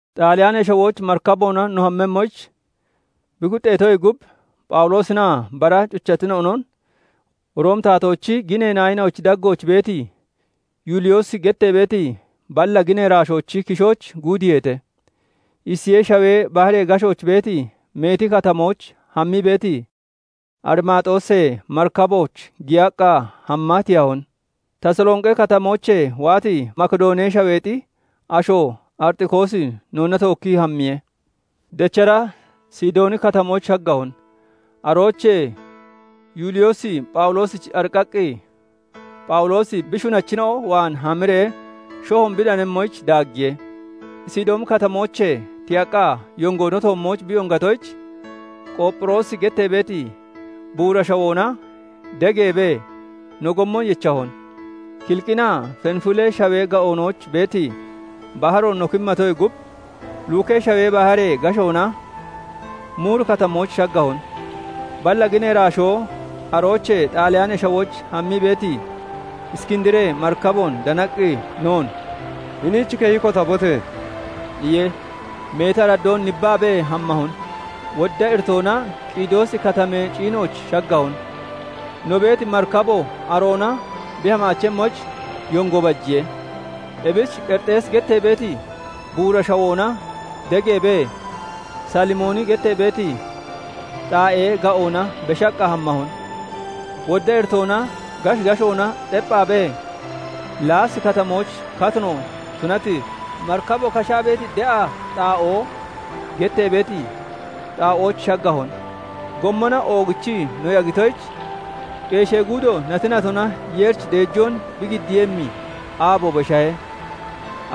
Xaaliyaanee Shawooch marikaboona no hammemmoyich bi kuxxeetoyee gub, Phawuloosinaa bara cuchatina'onon Roomi taatoochi ginee naayina'ochi daggooch beeti, Yuuliyoosi gettee beeti balla ginee iraashoochi kishooch guudiiheete. Isiyee Shawee baharee gashooch beeti meeti katamooch hammii beeti, Arimaaxoosee marikabooch giyaqqa hamma tiyahon. Tasalonqi Katamoochee waati, Makidoonee Shaweexi asho Axiriqoosi noonna tookkii hammiye. Dechara Sidooni Katamooch shaggahon. Aroochee Yuuliyoosi Phawuloosich ariqqaqqi, Phawuloosi bi shunachina'o waan hamiree shohoon bi danemmoyich daaggiye. Sidooni Katamoochee tiyaqqa yongo no toommooch bi yongatoyich, Qoopphiroosi gettee beeti, buura shawoona degeebee no gommon yechahon; Kiliqinaa Fenifulee Shawee ga'oonooch beeti baharoon no kimmatoyee gub, Lukee Shawee baharee gashoona Muuri Katamooch shaggahon. Balla ginee iraashoo aroochee Xaaliyaanee Shawooch hammii beeti, Iskindiree marikaboon danaqqi, noon "Hiniich keyi kotabote!" iye. Meeti araddoon nibbaabee hammahon; wodda iritoona Qiidoosi Katamee ciinooch shaggahon; no beeti marikabo aroona bi hamaachemmoyich yongo bajiye. Ebich Qerixeesi gettee beeti buura shawoona degeebee, Salimooni gettee beeti xaa'ee ga'oona beshaqqa hammahon. Wodda iritoona gashi gashoona xepphaabee, Laasi Katamooch katino tunati, "Marikabo kashaa beeti De'a Xaa'oo" getee beeti xaa'ooch shaggahon. Gommona oogichii no yagitoyich, qeeshee guudo nati natona Yeerich deejoon bi giddiiyemmi aabo beshahe.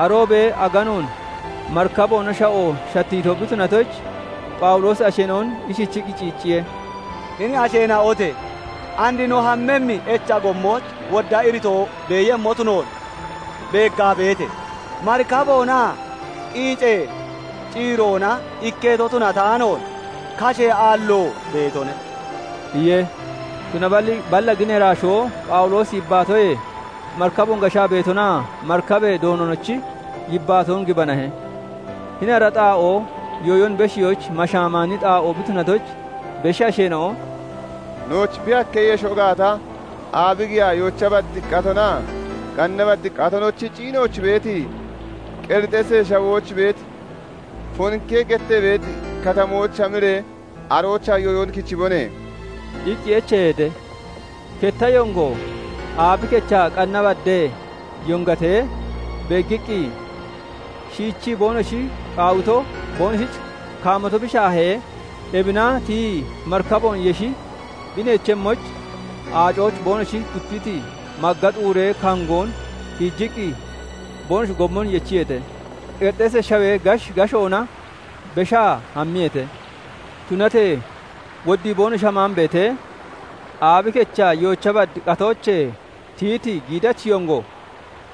Aroobee aganoon marikaboona sha'o shattiito bi tunatoyich, Phawuloosi asheena'on ishichiqqi ciicciye:- "Hini asheena'ote! And no hammemmi echa gommooch wodda iritoo beeyemmo tunoon beeggaa beete; marikaboonaa qiicee ciiroona ikketo tunataanoon, kashee aalloo beetone" iye. Tunaballi balla ginee iraashoo Phawuloosichi yibbaatoyee, marikaboon gashaa beetonaa marikabee doononochi yibbaatoon gibanahe. Hini ara xaa'oo yooyon beshiyoyich mashaamaani xaa'oo bi tunatoyich, beshi asheena'o "Nooch bi hakkeeyesho gaata, aabi giyaa yoocha bad qatonaa qanna bad qatonochi ciinooch beeti Qerixeesee Shawooch beeti Foonki gettee beeti katamooch hamiree, aroochaa yooyon kichibone!" iqqi echeeheete. Ketta yongo aabi kechaa qanna badee yongatee beeggiqqi, shiichii boonoshi qaawito boonoshich kaamato bi shaahee, ebina tiyii marikaboon yeshi bi neechemmoyich, aacooch boonoshi dupiti magga xuuree kangoon tiijiqqi boonoshi gommon yechiyeete. Qerixeesee Shawee gashi gashoona beshaa hammiyeete. Tunatee woddii boonoshi hamaan beete, aabi kechaa yoocha bad qatoochee tiyiti giidachi yongo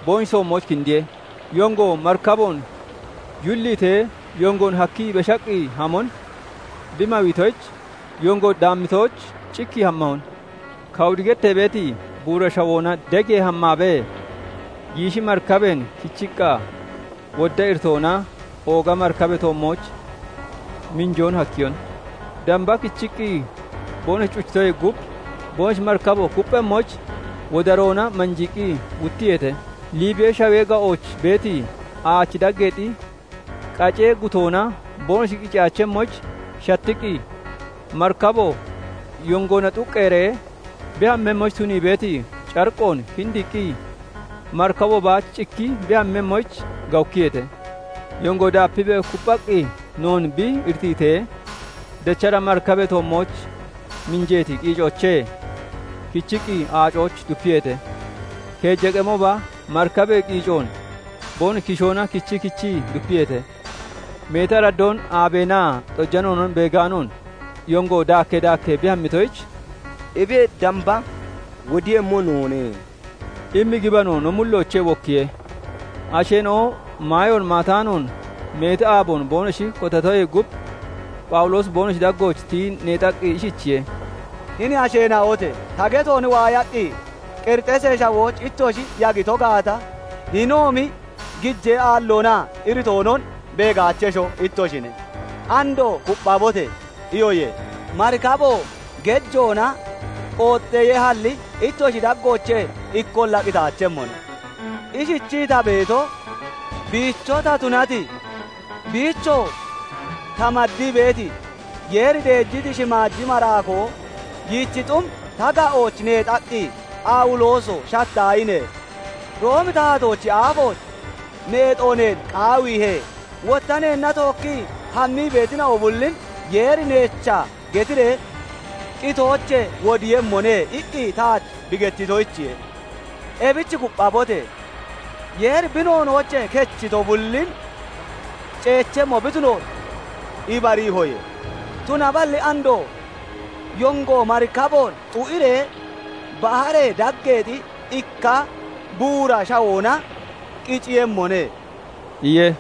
boonoshi toommooch kindiye. Yongo marikaboon yulliitee, yongoon hakkii beshaqqi hamon bi mawiitoyich, yongo daammitooch cikkii hammahon. Kawudi gettee beeti buura shawoona degee hammaabee, giishi marikabeen kichiqqa wodda iritoona ooga marikabee toommooch minjoon hakkiyon; damba kichiqqi boonoshi cuchitoyee gub, boonoshi beeti marikabo kupphemmoyich wodaroona manjiiqqi wuttiyeete. Liibiyee Shawee ga'ooch beeti aachi daggeexi qacee gutoona boonoshi qiciyaachemmoyich shattiqqi, marikabo yongoona xuqqeeree bi hammemmoyich tunii beeti cariqqoon kindiiqqi, marikabo baach cikkii bi hammemmoyich gawukkiyeete. Yongo daapiibee kupphaqqi noon bi iritiitee, dechara marikabee toommooch minjeeti qiicoochee kichiqqi aacooch dupiyeete; keeja qemooba marikabee qiicoon boonoshi kishoona kichii kichii dupiyeete. Meeti araddoon aabeenaa xojanoonon beegaanoon, yongo daakkee daakkee bi hammitoyich, "Ebiyee damba wodemmo noone" immi gibano no mulloochee wokkiye. Asheena'o maayoon maataanoon meeti aaboon boonoshi kotatoyee gub, Phawuloosi boonoshi daggooch tiyii neexaqqi ishichiye:- "Hini asheena'ote! Ta geton waayaqqi Qerixeesee Shawooch ittoshi yagito gaata, hinoomi gijee aalloonaa iritoonon beegaachesho ittoshine. Andoo 'Kupphabote!' iyoye; marikabo gejoona qooxxeeyehalli, ittoshi daggoochee ikkolla qitaachemmone. Ishichii ta beeto, biicho ta tunati, biichoo ta maddii beeti Yeeri deejiti shimaaji maraakoo yiichi xum ta ga'ooch neexaqqi, 'Phawulooso! Shattaahine! Roomi taatoochi aafooch neexo neen qaawiihe; wotta neenna tookkii hammii beetina'o bullin Yeeri neecha getiree qitoochee wodiiyemmone' iqqi taach bi gettitoyichiye. Ebich kupphabote! Yeeri bi noonoochee kechito bullin ceechemmo bi tunoon ibariihoye. Tunaballi andoo yongo marikaboon xu'iree baharee daggeexi ikka buura shawoona qiciiyemmone" iye.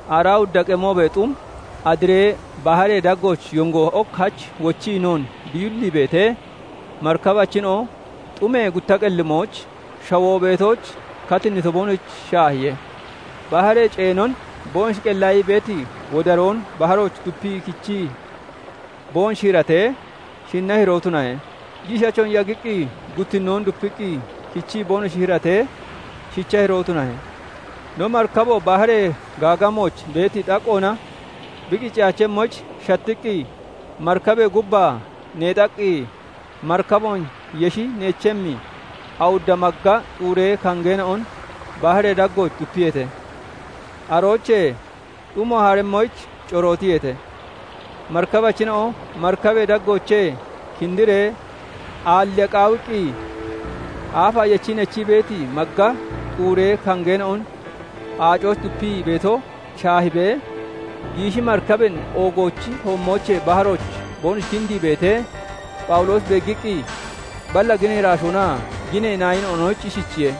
Aaraa awudda qemoobee xum Adiree Baharee daggooch yongo ok hach wochii noon bi yullii beetee, marikabachina'o xumee gutta qellimooch shawoo beetooch katinnito boonoshich shaahiye. Baharee ceenon boonoshi qellaayii beeti wodaroon baharooch dupii kichii boonoshi hiratee, shinna hiroo tunahe; giishachoon yagiqqi guttinnoo dupiqqi kichii boonosho hiratee shicha hiroo tunahe. No marikabo baharee gaagamooch beeti xaqqoona bi qiciyaachemmoyich shattiqqi, marikabee gubbaa neexaqqi, marikaboon yeshi neechemmi awudda magga xuuree kangeena'on baharee daggooch dupiyeete. Aroochee xumo haremmoyich corootiyeete. Marikabachina'o marikabee daggoochee kindiree aalliya qaawiqqi, aafaa yechii neechii beeti magga xuuree kangeena'on aacooch dupii beeto shaahiibee, giishi marikabeen oogoochi toommoochee baharooch boonoshi kindii beetee Phawuloosi beeggiqqi, balla ginee irashoonaa ginee naayina'onoyich ishichiye:-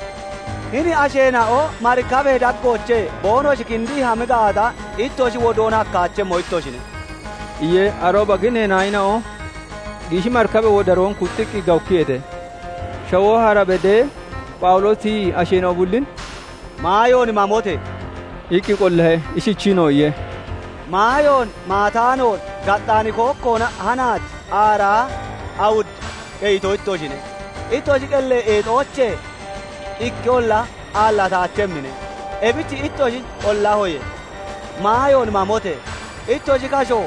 "Hini asheena'o marikabee daggoochee boonoshi kindii hami gaata, ittoshi wodoon hakkaachemmo ittoshine" iye. Arooba ginee naayina'o giishi marikabee wodaroon kuxxiqqi gawukkiyeete. Shawoo hara bedee, Phawuloosi tiyii asheena'o bullin "Maayoon mamote!" iqqi qollahe. Ishichiinoo iye:- "Maayoon maataanoon gaxxaani kookkoona hanaach aaraa awud qeyito ittoshine. Ittoshi qellee eexoochee ikkeolla aallataachemmine; ebich ittoshin qollahoye; maayoon mamote! Ittoshi kasho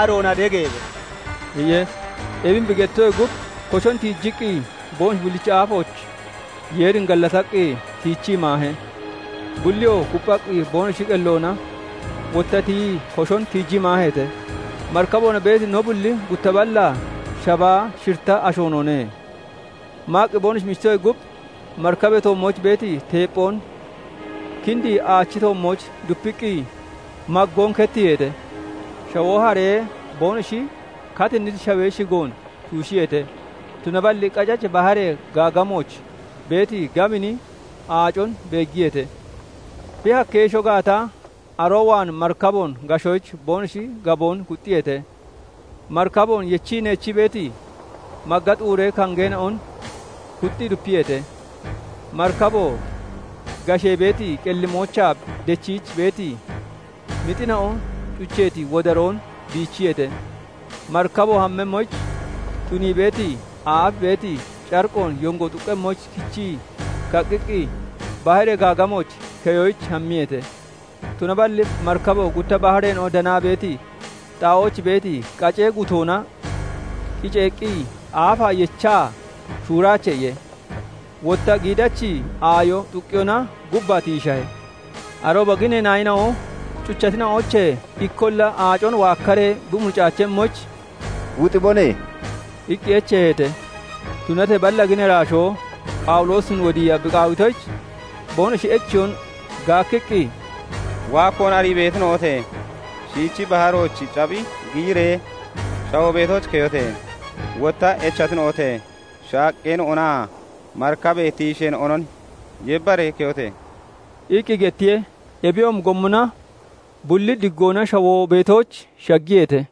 aroona degeebe!" iye. Ebin bi gettitoyee gub, koshon tiijiqqi boonoshi bullichi aafooch Yeerin gallataqqi tiichii maahe. Bulliyoo kupphaqqi boonoshi qelloona wotta tiyii koshon tiijii maaheete. Marikaboona beeti no bulli gutta ballaa shabaa shiritta asho noone. Maaqqi boonoshi michitoyee gub, marikabee toommooch beeti teepphoon kindii aachi toommooch dupiqqi maggoon kettiiheete. Shawoo haree, boonoshi katinniti shawee shigoon tuushiyeete; tunaballi qacachi baharee gaagamooch beeti gabini aacon beeggiyeete; bi hakkiyeesho gaata, aroo waan marikaboon gashoyich boonoshi gaboon kuxxiyeete. Marikaboon yechii neechii beeti magga xuuree kongeena'on kuxxii dupiyeete. Marikaboo gashee beeti qellimoochaa dechiich beeti mixina'o cucheeti wodaroon biichiyeete. Marikaboo hammemmoyich tunii beeti aaf beeti cariqoon yongo xuqqemmoyich kichii kaqqiqqi baharee gaagamooch keyoyich hammiyeete. Tunaballi marikabo gutta bahareena'o danaa beeti xaa'ooch beeti qacee gutoona qiceeqqi aafaa yechaa "Shuuraache" iye. Wotta giidachi aayo xuqqiyoona gubbaa tiishahe. Arooba ginee naayina'o cuchatina'oochee ikkolla aacon waakkaree bi muricaachemmoyich, "Wuxibone!" iqqi echeeheete. Tunatee balla ginee iraashoo Phawuloosin wodiiya bi qaawitoyich, boonoshi echeyoon gaakkiqqi, "Waakkoon arii beetina'ote! Shiichi baharooch capphi giyiree shawoo beetooch keyote! Wotta echatina'ote! Shaaqqeena'onaa marikabee tiisheena'onon yebbaree keyote!" iqqi gettiye. Ebiyoomi gommona bulli diggoona shawoo beetooch shaggiyeete.